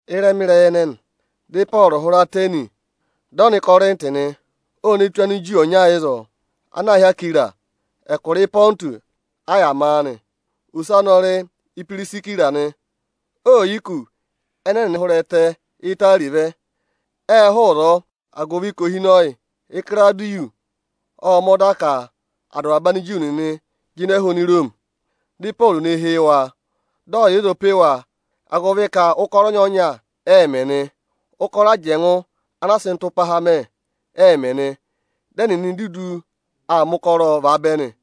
Ịrẹma ịrẹyị ẹnẹnị, dị Ịpọọrụ hụrẹ Atẹnị, dị ọ nọ Ịkọrịntị nị. O ne tù Aniju ọnya ịzọọ, ana aā hị́ Akwira; ẹkụra Ịpọntụsị a yà ma a nị. Ose anị ọ rị Ipirisira nị. Oò yi kù ẹnẹ ẹnịnị hụrẹ ẹtẹ Itari vẹ. Ệ hụụ ịzọọ, agụvị ka ohinọyị Ịkịrawụdịyọsị ộ mẹ̀ ọda ka à dụ avaba Aniju nịnị jịnẹ hụrẹ Iroomi. Dị Ịpọọrụ ne hee wa, dị ọ yà ịzọọ pe wa, agụvị ka ụkọrọ ọnyọọnya ẹẹ̄ mẹ nị. Ụkọrọ ajẹngụ ana aā sị ịtụmpahaa mẹ, ẹẹ̄ mẹ nị. Dị ẹnịnị dudu aa mẹ ụkọrọọ vaabẹ nị.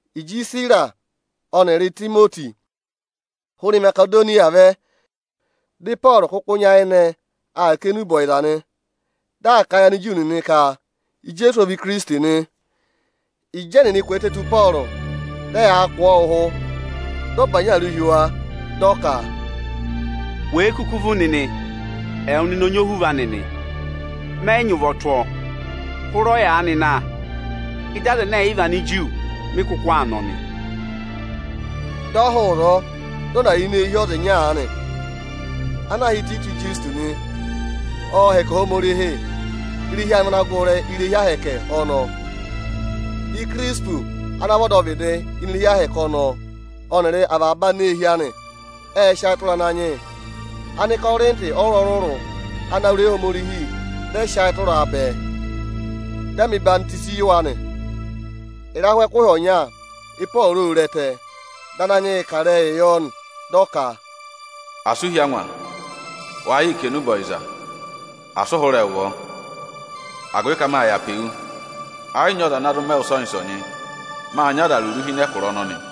Ịjị Isira ọnịrị Itimoti hụrẹ Imasedoniya vẹ, dị Ịpọọrụ kụkụ nyayịnẹ aa kà enube ọyịza nị. Dị aa kà a yị Aniju nịnị ka Ijeesu ọ vị Ikirisiti nị. Ịjị ẹnịnị kwẹẹtẹ tù Ịpọọrụ, dị ẹyaa kụ̀ ọọ ụhụ, dị ọ bànyị awuru hi wa, dị ọ ka, “Wèe kuku vú nịnị, ẹwụ nịnị ọ nyị ohuvọ anị nị! Mẹ yị nyị ụvọ tụ́ ịnị usu awụ nịnị. Hụrẹ ọyaanị na, ịdị Anigiriki, mị kụkụ aa nọ nị.” Dị ọ hụụ ịzọọ, dị ọ na yà ini eehi ọza ịnya aanị ana aā hị́ Ịtayịtọsị Ịjọsịtọsị nị. Ọọ̄ hẹkẹ Ohomorihi. Irehi anị vị ana gụrị irehi Ohomorihi ọnọọ. Ikirisipụsị ana vị ọdọvịdị ini irehi Ohomorihi ọnọọ ọnịrị avaba aneehi anị ệ sị ayị tụra Ananyị yị. Anịkọrịntị ọrụrụ-ọrụrụ ana wụ́ ịrẹyị Ohomorihi ệ rẹ sị ayị tụra a bẹẹ, dị a mẹ̀ ọyịhwọzenyi yị wa nị. Ịrahụ ẹkụhị ọnya, Ịpọọrụ ô re ẹtẹ, dị Ananyị yị kà ịrẹyịị yọ nị. Dị ọ ka, “Asị u hí angwa, wa yịị kà enube ọyịza! Asị ụ hụrẹ ụvọ, agụvị ka mâ yà pe wu. Ẹ yị nyị ọza ana zụ mẹ wụ ịsọnyị-ịsọnyị. Mâ nyị aza rụrụ hi ịnị ẹkụra ọnọnị.”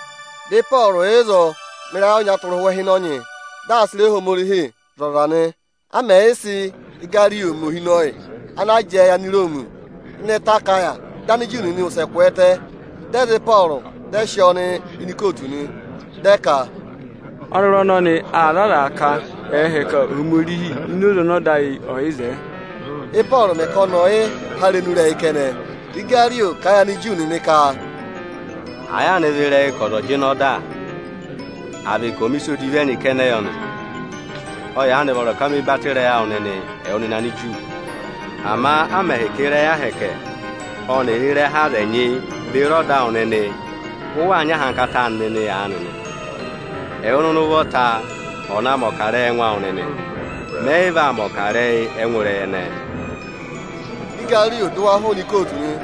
Dị Ịpọọrụ yà ịzọọ mẹ ịrayị ọnya tụra ụhwẹ ịhịnọnyị, dị aa sị ịrẹyị Ohomorihi zụ̀ aza nị. A mẹ̀ yị sị Igariyo rị ohinọyị ana jẹẹ yị Aniroomi ịnị ẹtẹ Akaya, dị Aniju nịnị wụsẹ kwẹẹtẹ, dị ẹ za Ịpọọrụ, dị ẹ sị ọọ nọ ikootu nị. Dị ẹ ka, “Ọnọrụ ọnọnị aa za aza ka ẹ̀ẹ hẹkẹ Ohomorihi ini oze ọnị ọda ayị ọ̀ yị zẹẹ.” Ị́pọọrụ mẹ̀ ka ọnị ọ̀ yị há irenu ịrẹyị kẹnẹ, dị Igariyo kà a yị Aniju nịnị ka, “Àa yaanị vị ịrẹyị ka ọza ộ jịnẹ ọda, à vị ka ộ mẹ̀ ịsa odivi ẹnyị kẹnẹ yọ nị, ọ yaanị vọrọ ka me batọ ịrẹyị awụ nịnị, ẹwụ nịnị Aniju. Ama a mẹ̀ hị́ ka ịrẹyị ahẹkẹ ọnịrị ịrẹha aza ẹnyị beri ọda awụ nịnị, ụ waa nyị ahankata anị nịnị aanị nị, ẹwụ nịnị ụvọta ọ̀ na mẹ̀ ọkarẹyị ẹngụ awụ nịnị! Mẹ yị vaa mẹ̀ ọkarẹyị ẹngụ ịrẹyị ẹnẹẹ.” Dị Igariyo dụ wa hụụnị ikootu nị.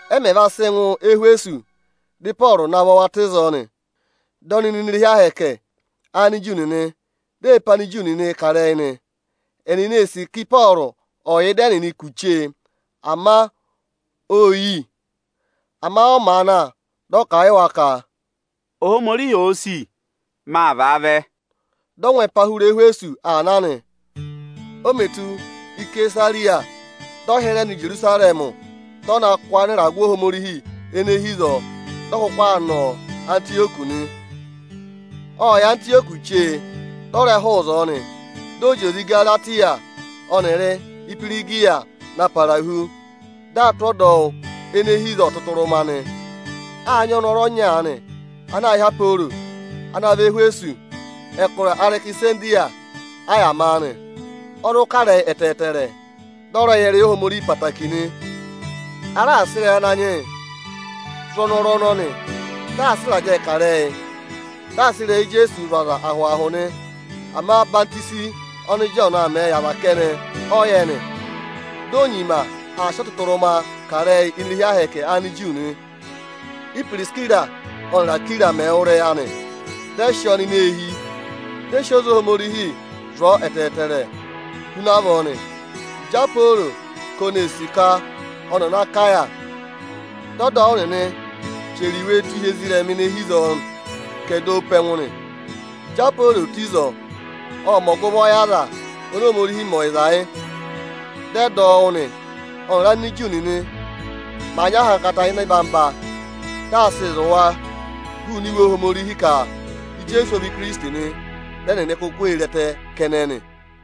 Ẹ mẹ̀ va sị ngụ Ẹhwẹsọsị, dị Ịpọọrụ navọ wa tụ́ ịzọọ nị. Dị ọnị nọ ini irehi Ohomorihi Aniju nịnị, di e pe Aniju nịnị kà ịrẹyị nị. Ẹnịnị ê sì ka Ịpọọrụ ọ̀ yà ịdị ẹnịnị kù chee, ama ô yi. Ama ọ màa na, dị ọ kà a yị wa ka, “Ohomorihi òo sì, maa vaavẹ.” Dị ọ ngụ ẹpa hụrẹ Ẹhwẹsọsị aa na nị. O mè tù Isesariya, dị ọ hịrẹ nọ Ijerusarẹmị, dị ọ na kụ́ anịragụ Ohomorihi ene hi ịzọọ, dị ọ kụkụ aa nọ Antịyọkị nị. Ộ yà Antịyọkị chee, dị ọ rẹ hụụ ịzọọ nị. Dị ọ zị oze Ịgaratịya ọnịrị Ihwirigiya na para hu, dị aa tụ́ ọdọwụ ene hi ịzọọ ọtụtụrụma nị. Â nyị ọnọrụ ọnya aanị ana aā hị́ Aporo, ana vẹ Ẹhwẹsọsị. Ẹkụra Arekisandiriya a yà maa nị. Ọ zụ kà ịrẹyị ẹtẹẹtẹrẹ, dị ọ rẹ yẹ ịrẹyị Ohomorihi ẹtẹẹtẹrẹ nị. A raà sị ịrẹyị Ananyị yị zụ̀ ọnọrụ ọnọnị. Dị aa sị ịrajẹẹ kà ịrẹyị, dị aa sị ịrẹyị Ijeesuu zụ̀ aza ahụ-ahụ nị. Ama ọyịhwọzenyi ọnị Ịjọọnụ aa mẹẹ yị aza kẹnẹ ọ yẹ nị. Di o nyima aa sị ọtụtụrụma kà ịrẹyị ini irehi Ohomorihi Aniju nị. Ípirisira ọnịrị Akwira mẹ̀ wụ́ ịrẹyị anị, dị ẹ sị ọọ nọ ini eehi, dị ẹ sị oze Ohomorihi zụ̀ ọọ ẹtẹẹrẹ huna avọọ nị. Ịjị Aporo ka oni ee sì ka ọnị ọ̀ nọ Akaya, dị ọdọwụ nịnị chẹrẹ iwe tụ́ hi ezirẹma ene hi ịzọọ ka ẹ̀ dọ ọ pe ẹngụ nị. Ịjị Aporo tù ịzọọ, ộ mẹ̀ ọgụvọ yị aza oni Ohomorihi mẹ ọyịza yị, dị ẹ dọ wụ́ nị. Ọ́nịrị Aniju nịnị màa nyị ahankata ịnị orere dị aa sịị zụ̀ waa hụụnị Iwe Ohomorihi ka Ijeesu ọ vị Ikirisiti nị; dị ẹnịnị kuku ee re ẹtẹ kẹnẹ nị.